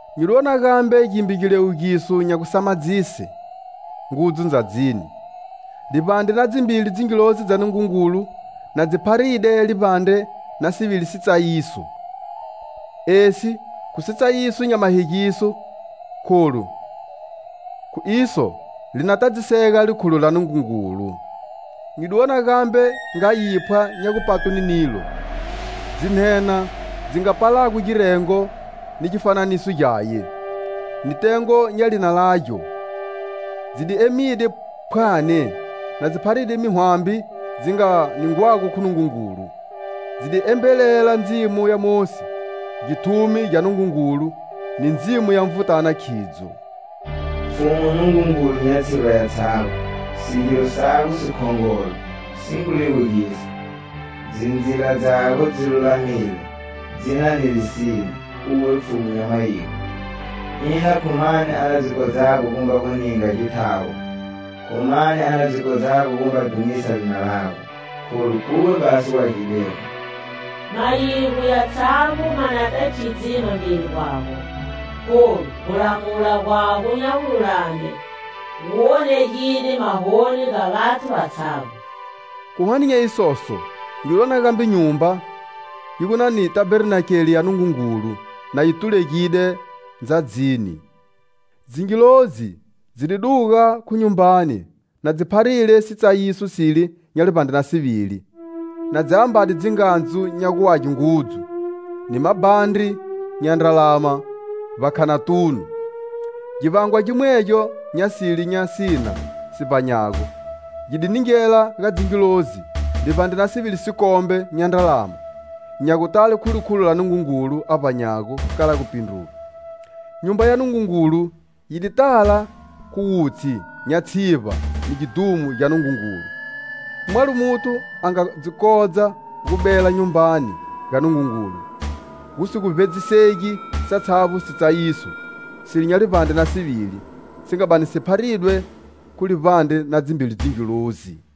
Nyi di wona gambe gimbe giliwugiso nya gusamadzise ngudzu ndzadzini: livbandre na dzimbili dzingilozi dza Nungungulu, na dzii pharide livbandre na sivili sitsayiso. Esi khu sitsayiso nya mahegiso kholu khu iso li na tadzisega likhulo la Nungungulu. Nyi di wona gambe nga yiphwa nya gupatwe ni nilo. Dzinhenha dzi nga palago girengo ni gifananiso gyaye, ni tengo nya lina lagyo, dzi di emide phwani, na dzi pharide mihwambi dzi nga ningwago khu Nungungulu. Dzi di embelela ndzimo ya Mosi, githumi gya Nungungulu ni ndzimo ya Nvutana khidzo: "Pfhumu Nungungulu, nya tshivba yatshavbo,sigiro sago sikhongolo, si ngu liwugisa!Dzindzila dzago dzi lulamile, dzi na ni lisine, uwe Pfhumu nya mayigo. Ina khu mani a na dzi kodzago gumba gu ninga githawo?Khu mani a na dzi kodzago gumba dhumisa lina lago? Kholu, khuwe basi u Agidego! Mayigo yatshavbo ma nata khidzima mbeli gwago,kholu gulamula gwago nya gululame, gu wonegide mahoni ga vathu vatshavbo." Khu hwane nya isoso nyi di wona gambe Nyumba, yi gu na ni Tabernakele ya Nungungulu na yi tulegide ndzadzini. Dzingilozi dzi di duga khu Nyumbani, na dzi pharile sitsayiso sile nya livbandre na sivili, na dzi ambade dzingandzu nya gu age ngudzu, ni mabhandri nya ndralama vbakhanatunu. Givangwa gimwegyo nya sile nya sina si vbanyago: gi di ningela ga dzingilozi livbandre na sivili sikombe nya ndralama nya gutale khu likhulo la Nungungulu a vbanyago kala gupindruga. Nyumba ya Nungungulu yi di tala khu wutshi nya tshivba ni gidhumo gya Nungungulu. Mwalo muthu a nga dzi kodza gu bela Nyumbani ga Nungungulu, gu si gu vbedzisegi satshavbo sitsayiso sile nya livbandre na sivili, si nga bani si pharidwe khu livbandre na dzimbili dzingilozi.